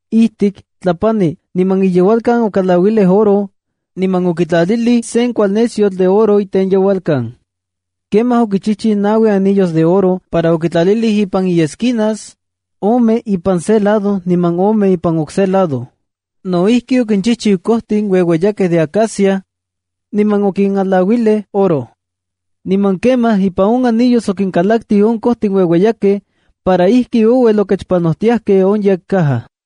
Ijtik, tlapani, niman iyeualkan okalauilij oro, niman okitlalilij sen kualnesyotl de oro itenyeualkan. Kemaj okichijchiu naui anillos de oro para okitlalilij ipan iesquinas, ome ipan se lado niman ome ipan on okse lado. No ijki, okinchijchiu kojtin ueueyakej de acacia, niman okinalauilij oro. Niman kemaj ipan on anillos okinkalaktij on kojtin ueueyakej para ijki ouel okechpanojtiajkej on yekcaja.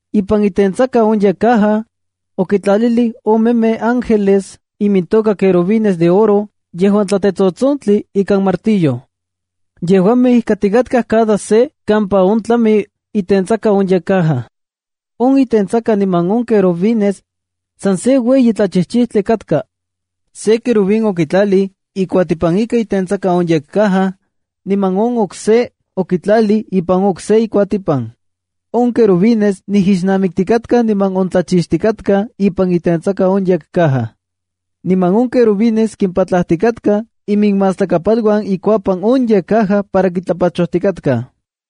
Ipan itentsaka on yekcaja, okitlalij omemej ángeles imintoka querubines de oro yejuan tlatetsotsontli ika martillo. Yejuamej ijkatikatkaj cada se kampa on tlami itentsaka on yekcaja. On itentsaka niman on querubines san se ueyi tlachijchijtli katka. Se querubín okitlalij ikuatipan ika itentsaka on yekcaja niman on okse okitlalij ipan on okse ikuatipan. On querubines nijixnamiktikatkaj niman ontlachixtikatkaj ipan itentsaka on yekcaja. Niman on querubines kimpatlajtikatkaj iminmastlakapaluan ikuapan on yekcaja para kitlapachojtikatkaj.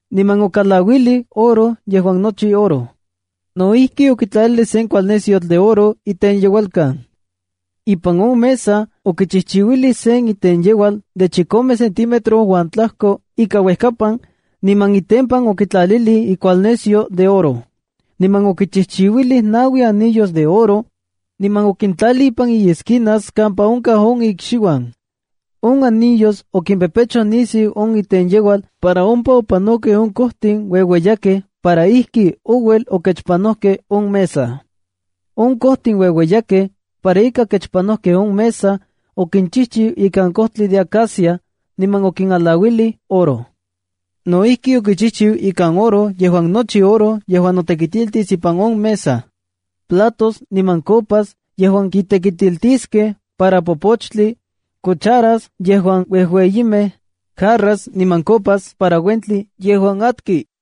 Niman okalauilij oro yejuan más kuajli. No ijki, okitlalilij sen kualnesyotl de oro itenyeualkan. Ipan on mesa okichijchiuilij sen itenyeual de chikome centímetro uan tlajko ika uejkapan, niman itempan okitlalilij ikualnesyo de oro. Niman okichijchiuilij naui anillos de oro, niman okintlalij ipan iesquinas kampa onkaj on ikxiuan. On anillos okimpepechoj nisiu on itenyeual para ompa opanokej on kojtin ueueyakej para ijki ouel okechpanojkej on mesa. On kojtin ueueyakej para ika okechpanojkej on mesa okinchijchiu ikan kojtli de acacia, niman okinalauilij oro. No ijki, okichijchiu ikan oro yejuan más kuajli yejuan notekitiltis ipan on mesa: platos niman copas yejuan kitekitiltiskej para popochtli, cucharas yejuan uejueyimej, jarras niman copas para uentli yejuan atki.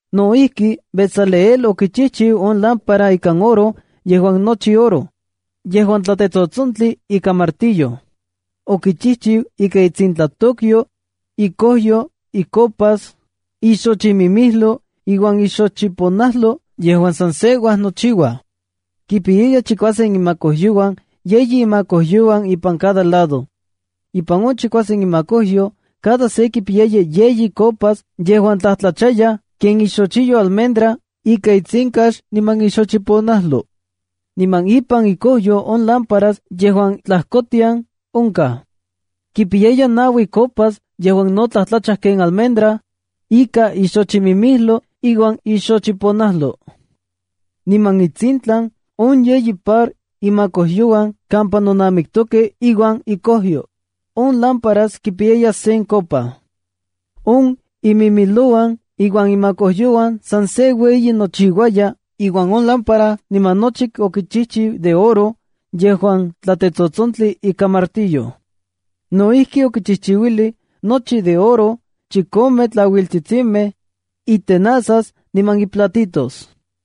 No ijki, Bezaleel okichijchiu on lámpara ikan oro yejuan más kuajli, yejuan tlatetsotsontli ika martillo. Okichijchiu ika itsintlatokyo, ikojyo, icopas, ixochimimijlo iuan ixochiponajlo yejuan san se uajnochiuaj. Kipiyaya chikuasen imakojyouan, yeyi imakojyouan ipan cada lado. Ipan on chikuasen imakojyo, cada se kipiyaya yeyi copas yejuan tlajtlachayaj ken ixochiyo almendra ika itsinkax niman ixochiponajlo. Niman ipan ikojyo on lámpara yejuan tlajkotian onkaj, kipiyaya naui copas yejuan no tlajtlacha ken almendra, ika ixochimimijlo iuan ixochiponajlo. Niman intsintlan on yeyi par imakojyouan kampa nonajnamiktokej iuan ikojyo, on lámpara kipiyaya sen copa. On imimijlouan iuan imakojyouan san se ueyi nochiuaya iuan on lámpara niman nochi okichijchiu de oro yejuan tlatetsotsontli ika martillo. No ijki, okichijchiuilij nochi de oro chikome tlauiltsitsimej, itepostlakitskil niman iplatitos.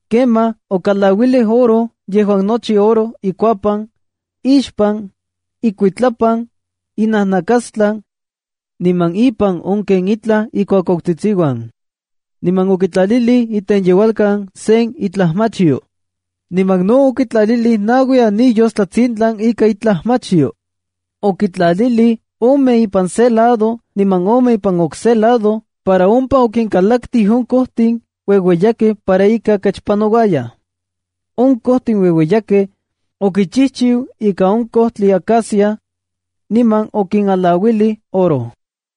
Kemaj okalauilij oro yejuan más kuajli ikuapan, ixpan, ikuitlapan, inajnakastlan, niman ipan on ken itlaj ikuakuautsitsiuan. Niman okitlalilij itenyeualkan sen itlajmachyo. Niman no okitlalilij naui anillos tlatsintlan ika itlajmachyo. Okintlalilij ome ipan se lado niman ome ipan okse lado para ompa okinkalaktij on kojtin ueueyakej para ika kechpanouayaj. On kojtin ueueyakej okinchijchiu ika on kojtli acacia, niman okinalauilij oro.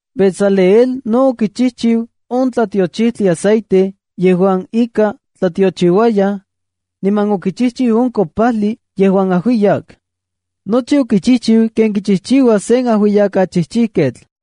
Bezaleel no okichijchiu on tlatiochijtli aceite yejuan ika tlatiochiuayaj, niman okichijchiu on kopajli yejuan ajuiyak. Nochi okichijchiu ken kichijchiua sen ajuiyakachijchijketl.